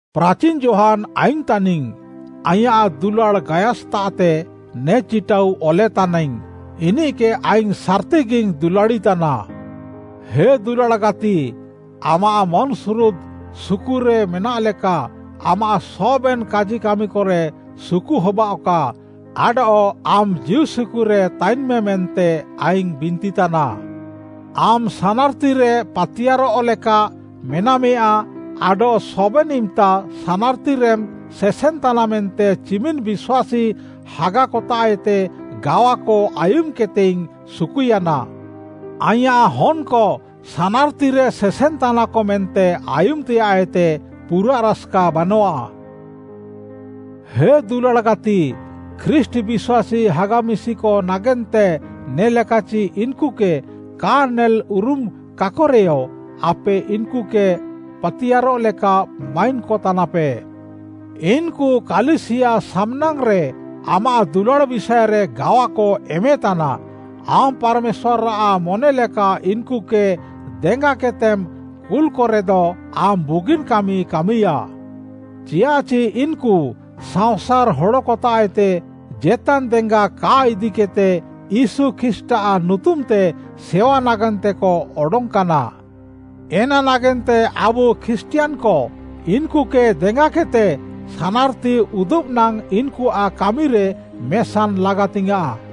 ପ୍ରାଚିନ୍‌ ଯୋହାନ୍‌ ଆଇଙ୍ଗ୍‌ ତାନିଙ୍ଗ୍‌, ଆଇଁୟାଃ ଦୁଲାଡ଼୍‌ ଗାୟସ୍‌ତାଃତେ ନେ ଚିଟାଉ ଅଲେତାନାଇଙ୍ଗ୍‌। ଇନିଃକେ ଆଇଙ୍ଗ୍‌ ସାର୍‌ତିଗିଙ୍ଗ୍‌ ଦୁଲାଡ଼ିତାନା। ହେ ଦୁଲାଡ଼୍‌ ଗାତି, ଆମାଃ ମନ୍‌ସୁରୁଦ୍‌ ସୁକୁରେ ମେନାଃଲେକା, ଆମାଃ ସବେନ୍‌ କାଜିକାମିକରେ ସୁକୁ ହବାଅଃକା ଆଡଃ ଆମ୍‌ ଜୀଉସୁକୁରେ ତାଇନ୍‌ମେ ମେନ୍ତେ ଆଇଙ୍ଗ୍‌ ବିନ୍ତିତାନା। ଆମ୍‌ ସାନାର୍‌ତିରେ ପାତିୟାର୍‌ରଃ ଲେକା ମେନାମେୟାଁ ଆଡଃ ସବେନ୍‌ ଇମ୍‌ତା ସାନାର୍‌ତିରେମ୍‌ ସେସେନ୍‌ତାନା ମେନ୍ତେ ଚିମିନ୍‌ ବିଶ୍ୱାସୀ ହାଗାକତାଃଏତେ ଗାୱାକ ଆୟୁମ୍‌କେଦ୍‌ତେଇଙ୍ଗ୍‌ ସୁକୁୟାନା। ଆଇଁୟାଃ ହନ୍‌କ ସାନାର୍‌ତିରେ ସେସେନ୍‌ତାନାକ ମେନ୍ତେ ଆୟୁମ୍‌ତେୟାଃଏତେ ପୁରାଃ ରାସ୍‌କା ବାନଃଆ। ହେ ଦୁଲାଡ଼୍‌ ଗାତି, ଖ୍ରୀଷ୍ଟ୍‌ ବିଶ୍ୱାସୀ ହାଗା ମିଶିକ ନାଗେନ୍ତେ ନେ'ଲେକାଚି ଇନ୍‌କୁକେ କା ନେଲ୍‌ ଉରୁମ୍‌କାକରେୟ, ଆପେ ଇନ୍‌କୁକେ ପାତିୟାର୍‌ରଃ ଲେକା ମାଇନ୍‌କତାନାପେ। ଇନ୍‌କୁ କାଲିସିୟା ସାମ୍‌ନାଙ୍ଗ୍‌ରେ ଆମାଃ ଦୁଲାଡ଼୍‌ ବିଷାଏରେ ଗାୱାକ ଏମେତାନା। ଆମ୍‌ ପାର୍‌ମେଶ୍ୱାର୍‌ଆଃ ମନେଲେକା ଇନ୍‌କୁକେ ଦେଙ୍ଗାକେଦ୍‌ତେମ୍‌ କୁଲ୍‌କରେଦ ଆମ୍‌ ବୁଗିନ୍‌ କାମିମ୍‌ କାମିୟା। ଚିୟାଃଚି ଇନ୍‌କୁ ସାଅଁସାର୍‌ ହଡ଼କତାଃଏତେ ଜେତାନ୍‌ ଦେଙ୍ଗା କା ଇଦିକେଦ୍‌ତେ ୟୀଶୁ ଖ୍ରୀଷ୍ଟ୍‌ଆଃ ନୁତୁମ୍‌ତେ ସେୱା ନାଗେନ୍ତେକ ଅଡଙ୍ଗ୍‌କାନା। ଏନା ନାଗେନ୍ତେ ଆବୁ ଖ୍ରୀଷ୍ଟିୟାନ୍‌କ ଇନ୍‌କୁକେ ଦେଙ୍ଗାକେଦ୍‌ତେ ସାନାର୍‌ତି ଉଦୁବ୍‌ ନାଙ୍ଗ୍‌ ଇନ୍‌କୁଆଃ କାମିରେ ମେସାନ୍‌ ଲାଗାତିଙ୍ଗ୍‌ୟାଁଃ।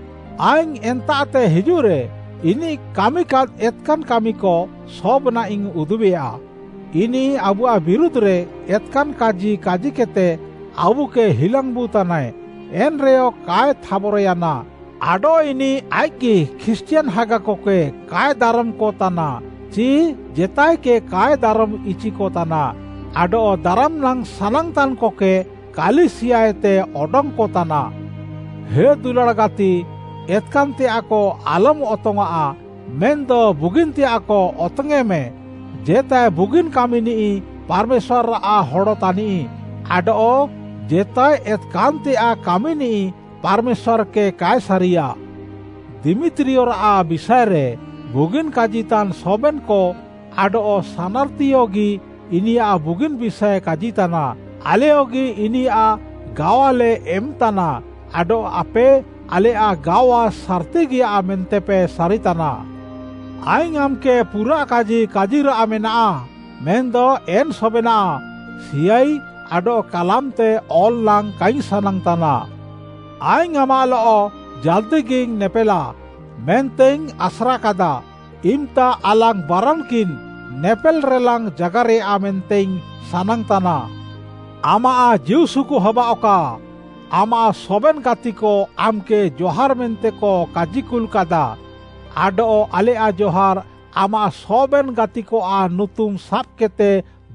ଆଇଙ୍ଗ୍‌ ଏନ୍ତାଃତେ ହିଜୁଃରେ, ଇନିଃ କାମିକାଦ୍‌ ଏତ୍‌କାନ୍‌ କାମିକ ସବେନାଃଇଙ୍ଗ୍‌ ଉଦୁବେୟା। ଇନିଃ ଆବୁଆଃ ବିରୁଧ୍‌ରେ ଏତ୍‌କାନ୍‌ କାଜି କାଜିକେଦ୍‌ତେ ଆବୁକେ ହିଲାଙ୍ଗ୍‌ବୁ ତାନାଏ, ଏନ୍‌ରେୟ କାଏ ଥାବର୍‌ୟାନା। ଆଡଃ ଇନିଃ ଆଇଃକ୍‌ଗି ଖ୍ରୀଷ୍ଟିୟାନ୍‌ ହାଗାକକେ କାଏ ଦାରମ୍‌କ ତାନା ଚି ଜେତାଏକେ କାଏ ଦାରମ୍‌ଇଚିକ ତାନା। ଆଡଃ ଦାରମ୍‌ନାଙ୍ଗ୍‌ ସାନାଙ୍ଗ୍‌ତାନ୍‌କକେ କାଲିସିୟାଏତେ ଅଡଙ୍ଗ୍‌କତାନା। ହେ ଦୁଲାଡ଼୍‌ ଗାତି, ଏତ୍‌କାନ୍‌ତେୟାଃକ ଆଲମ୍‌ ଅତଙ୍ଗ୍‌ଆଁଃ, ମେନ୍‌ଦ ବୁଗିନ୍‌ତେୟାଃକ ଅତଙ୍ଗ୍‌ୟେଁମେ। ଜେତାଏ ବୁଗିନ୍‌ କାମିନିଃ ପାର୍‌ମେଶ୍ୱାର୍‌ଆଃ ହଡ଼ ତାନିଃ, ଆଡଃ ଜେତାଏ ଏତ୍‌କାନ୍‌ତେୟାଃ କାମିନିଃ ପାର୍‌ମେଶ୍ୱାର୍‌କେ କାଏ ସାରିୟା। ଦିମିତ୍ରୀୟଆଃ ବିଷାଏରେ ବୁଗିନ୍‌ କାଜିତାନ୍‌ ସବେନ୍‌କ ଆଡଃ ସାନାର୍‌ତିୟଗି ଇନିୟାଃ ବୁଗିନ୍‌ ବିଷାଏ କାଜିତାନା। ଆଲେୟଗି ଇନିୟାଃ ଗାୱାଲେ ଏମ୍‌ତାନା ଆଡଃ ଆପେ, ଆଲେୟାଃ ଗାୱା ସାର୍‌ତିଗିଆ ମେନ୍ତେପେ ସାରିତାନା। ଆଇଙ୍ଗ୍‌ ଆମ୍‌କେ ପୁରାଃ କାଜି କାଜିରାଃ ମେନାଃ, ମେନ୍‌ଦ ଏନ୍‌ ସବେନାଃ ସିହାଇ ଆଡଃ କାଲାମ୍‌ତେ ଅଲ୍‌ ନାଙ୍ଗ୍‌ କାଇଙ୍ଗ୍‌ ସାନାଙ୍ଗ୍‌ତାନା। ଆଇଙ୍ଗ୍‌ ଆମାଃଲଃ ଜାଲ୍‌ଦିଗିଇଙ୍ଗ୍‌ ନେପେଲା ମେନ୍ତେଇଙ୍ଗ୍‌ ଆସ୍ରାକାଦା, ଇମ୍‌ତା ଆଲାଙ୍ଗ୍‌ ବାରାନ୍‌କିନ୍‌ ନେପେଲ୍‌ରେଲାଙ୍ଗ୍‌ ଜାଗାରେୟା ମେନ୍ତେଇଙ୍ଗ୍‌ ସାନାଙ୍ଗ୍‌ତାନା। ଆମାଃ ଜୀଉସୁକୁ ହବାଃଅକା। ଆମାଃ ସବେନ୍‌ ଗାତିକ ଆମ୍‌କେ ଜହାର୍‌ ମେନ୍ତେକ କାଜିକୁଲ୍‌କାଦା। ଆଡଃ ଆଲେୟାଃ ଜହାର୍‌ ଆମାଃ ସବେନ୍‌ ଗାତିକଆଃ ନୁତୁମ୍‌ ସାବ୍‌କେଦ୍‌ତେ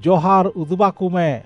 ଜହାର୍‌ ଉଦୁବାକମେ।